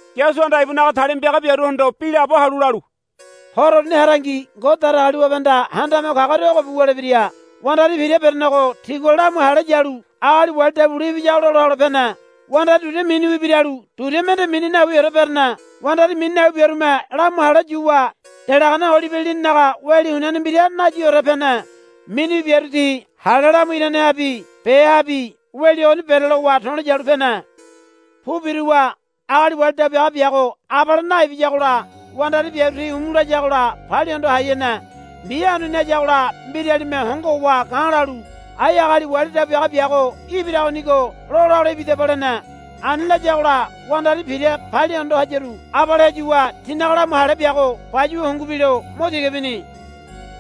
Yasuhanda ibunaga talima piaga biaruhondo bi laabo halu lalu, Horo uruni harangi Ngode Datagaliwabehanda Handame Ho Kagoria ogobi wulebira. Wandari pira berenego tigua lamu hale yalu agali wali dabu bule ibiyago lola hole pene. Wandari duria miniwi biralu duria mende mini nawiore berene. Wandari mini nawi biarume lamu hale yuwa delagane olibe lininaga weli huniane mbira nayiore pene. Miniwi biaru ti hale lamu iranehabi behabi weli ogoni berelowa to̱lo yalu pene. Pu biruwa agali wali dabu biaga biago abale naibiyagola wandari biaru ti umu layagola palia hondo hai hene. Mbi hanuni hayagola mbiralime hongo howa ga̱ lalu, Ai agali wali dabu biaga biago ibiragonigo lola hole ibidaba, lene. Ani layagola wandari pira palia hondo hayaru abale heyuwa tinaga lamu hale biago bayuwa hungu bilo mo tiga bini.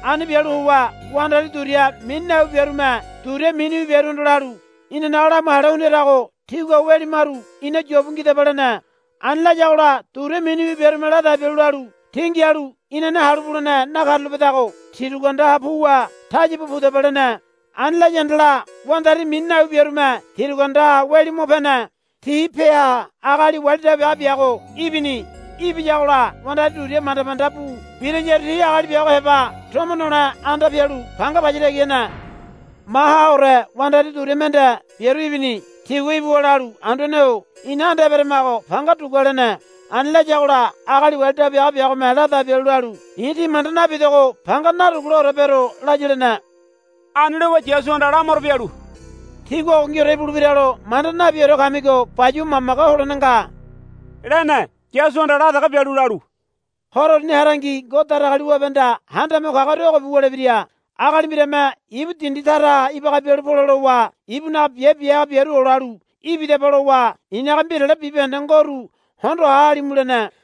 Ani bialu howa wandari duria mini nawi biarume duria miniwi biaruhondo lalu, Inanaga lamu hale hundirago tígua weli maru ina yobu ngidaba, lene. Ani layagola duria miniwi biarume ladai bialu lalu, Tí ngialu inane halu bulene nakarulapedago tirugu anda puwa taya bu pudaba, lene. Ani laya handala wandari mini nawi biarume tirugu andaha weli mo pene. Ti peaha agali wali dabu biaga biago ibini. Ibiyagola wandari duria manda manda bu birayaru ti agali biago heba tomo nole anda pialu panga paya tagi hene. Mahaore wandari duria mende biaru ibini. Tigua ibuwa lalu, Anduane-o ina anda eberamago panga dugua, lene. Ani layagola agali wali dabu biaga biagome ladai bialu lalu, I̱ tí manda nabidogo panga naduguleore bero, laya, lene. Ani lowa Yasuhanda lamaro bialu, Tígua ogongiore ibulebiralo manda nabiore kamigo bayuwa mamage holene nga, lene. Yasuhanda la dege bialu lalu, Horo uruni harangi Ngode Datagaliwabehanda Handame Ho Kagoria ogobi wulebira. Agali mbirame ibu dindi taraha ibaga bialu pole lowa ibunaga biabe bia haga biaru olalu, Ibidaba, lowa, I̱naga mbirale bibahende ngoru hondo ha halimu, lene.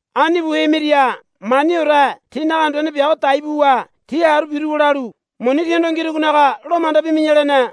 Ani bu hemiria maniore tinaga anduane biago dai buwa ti haru biruwa lalu, Muni tíhondo ngirugonaga lo manda bimi̱ya, lene.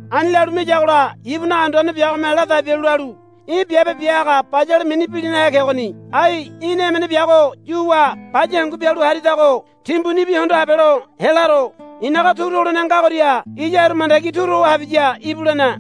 Ani lalu miyagola ibunaga anduane biagome ladai bialu lalu, Í̠ biabe bia haga bayale mini bilinahe kegoni. Ai í̠na emene biago yuwa baya hangu bialu haridago timbunibi hondo habelo helaro. I̱naga turu holene ngagoria iya haru mandagi turu ho habiya íbu, lene.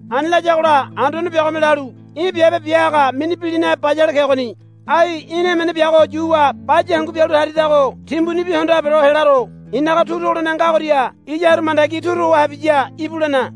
Ani layagola anduane biagome lalu, Í̠ biabe bia haga mini bilinahe bayale kegoni. Ai í̠na emene biago yuwa baya hangu bialu haridago timbunibi hondo habelo helaro. I̱naga turu holene ngagoria iya haru mandagi turu ho habiya íbu, lene.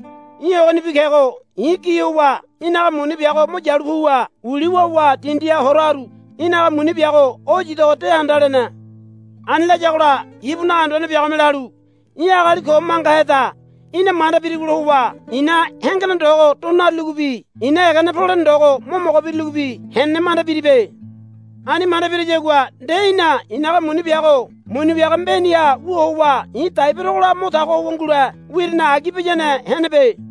Í̠ ogonibi kego i̱ gi howa í̠naga muni biago mo yalu puwa uli wawa dindiha hora haru. Í̠naga muni biago o yidogo de handa, lene. Ani layagola ibunaga anduane biagome lalu, Í̠ agali ko mangaheda. Í̠na manda birigola howa i̱na hengene ndogo do naruligobi i̱na egene polene ndogo mo mogo biruligobi henene manda biribe. Ani manda biriyagua nde í̠na i̱naga muni biago muni wiaga mbeniha wu howa i̱ dai berogola mo tago howa ngule wirine agi biyane henebe.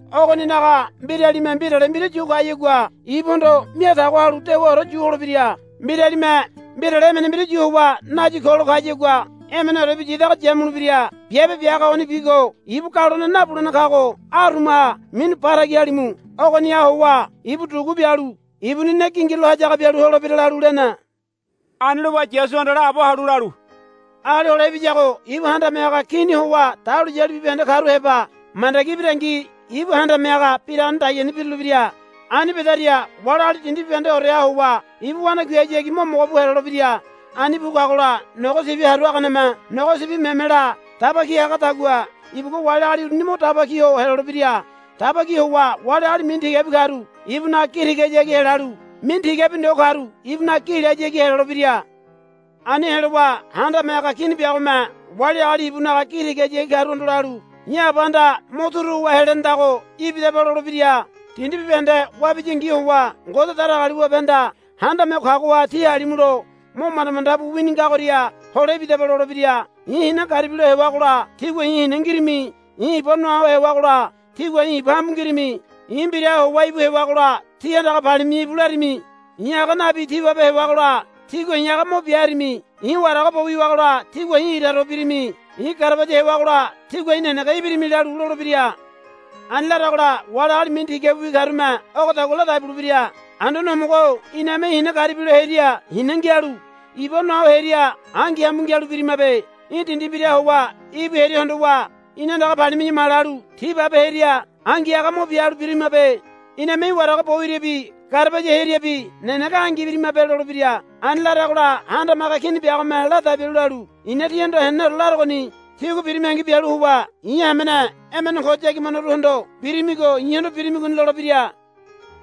Ogoninaga mbiralime mbirale mbira yu kayagua ibuhondo mia tago halu dewaore yu holebira. Mbiralime mbirale emene mbira yu howa nayi kolo kayagua emeneorebi yidago yamulebira. Biabe bia haga ogonibigo ibu galone nabulene kago arumaha minu ba tagi halimu. Ogoniha howa ibu dugu bialu ibuni ne gingirulo hayaga bialu holebira, lalu lene. Ani lowa Yasuhanda laabo halu lalu, Agali Hole Ibiyago ibu Handame Haga Kini howa dahuliyali bibahende karu heba mandagi ibirangi ibu handame haga biragane dagiani birulebira. Ani bedaria wali agali dindi bibahendeoreha howa ibu wanakuihayagi mo mogo bu helolebira. Ani bu kagola nogo sibi haru haganeme nogo sibi memela daba ki hagadagua ibugua wali agali uruni mo daba ki ho helolebira. Daba ki howa wali agali mini tigabi karu ibunaga gi tigahayagi helalu mini tigabi ndo karu ibunaga gi lehayagi helolebira. Ani helowa Handame Haga Kini biagome wali agali ibunaga gi tigahayagi karuhondo lalu, I̱ Abahanda mo turu howa helenedago ibidaba, lolebira. Dindi bibahende wabiyangi howa Ngode Datagaliwabehanda handame ho kagoha tí halimulo mo manda manda bu wini ngagoria hole ibidaba, lolebira. I̱ hina garibi lo hewagola tígua i̱ hina ngirimi. I̱ iba noa ho hewagola tígua i̱ iba hambu ngirimi. I̱ mbiraha howa íbu hewagola tí andaga palimi̱ya íbu larimi. I̱ aga nabi tibabe hewagola tígua i̱ aga mo bia harimi. I̱ warago bo wiwagola tígua i̱ ira to birimi. I̱ garabaya hewagola tígua i̱ nenege ibirimi, lalu lolebira. Ani laragola wali agali mini tigabiwi karume ogodagua ladai bulebira, Anduane Homogo-o iname í̠ hina garibi lo heria hina ngialu iba noa ho heria angi hambu ngialu birimabe. Í̠ dindi mbiraha howa íbu heria hondowa ina andaga palimi̱ya ma lalu tibabe heria angi aga mo bia halu birimabe. Iname í̠ warago bo wiriabi garabaya heriabi nenege angi ibirimabe, lolebira. Ani laragola Handame Haga Kini biagome ladai bialu lalu, I̱na tíhondo heneneore larogoni. Tígua birimiangi bialu howa i̱ hamene emene ko yagibanoruhondo birimigo i̱hondo birimigoni, lolebira.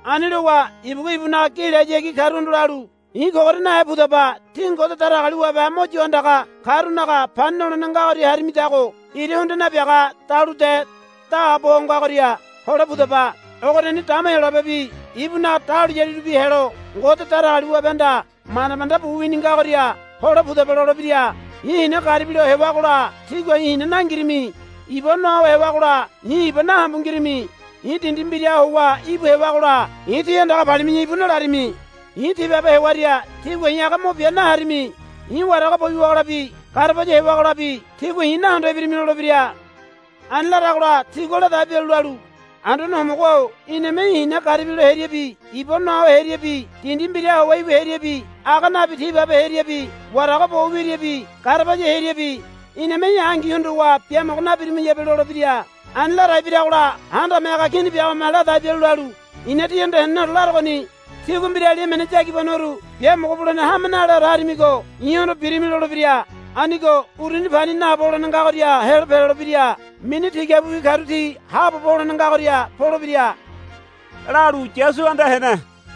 Ani lowa ibugua ibunaga gi lehayagi karuhondo lalu, I̱ kogoria nahe pudaba. Tí Ngode Datagaliwabe mo yo handaga karunaga pani nolene ngagoria harimidago ira hundia nabiaga dalude daabo ho ngagoria hole pudaba. Ogoriani dama Heyolabebi ibunaga dahuliyalirubi helo Ngode Datagaliwabehanda manda manda bu wini ngagoria hole pudaba, lolebira. I̱ hina garibilo hewagola tígua i̱ hina nangirimi. Iba noa ho hewagola i̱ iba nahambu ngirimi. I̱ dindi mbiraha howa íbu hewagola i̱ tí andaga palimi̱ya íbu nalarimi. I̱ tibabe hewaria tígua i̱ aga mo bia naharimi. I̱ warago bo wiwagolabi garabaya hewagolabi tígua i̱ nahondo ibirimi, lolebira. Ani laragola tigua ladai bialu lalu, Anduane Homogo-o iname í̠ hina garibi lo heriabi iba noa ho heriabi dindi mbiraha howa íbu heriabi aga nabi tibabe heriabi warago bo wiriabi garabaya heriabi iname í̠ angi hondowa biamogo nabirimayabe, lolebira. Ani ladai biragola Handame Haga Kini biagome ladai bialu lalu, I̱na tihondo heneneore larogoni. Tígua mbirali emene yagibanoru biamogo bulene hame naleore harimigo i̱hondo birimi, lolebira. Anigo uruni pani naabo holene ngagoria helo pelolebira. Mini tigabiwi karu ti haabobo holene ngagoria polebira, lalu Yasuhanda hene.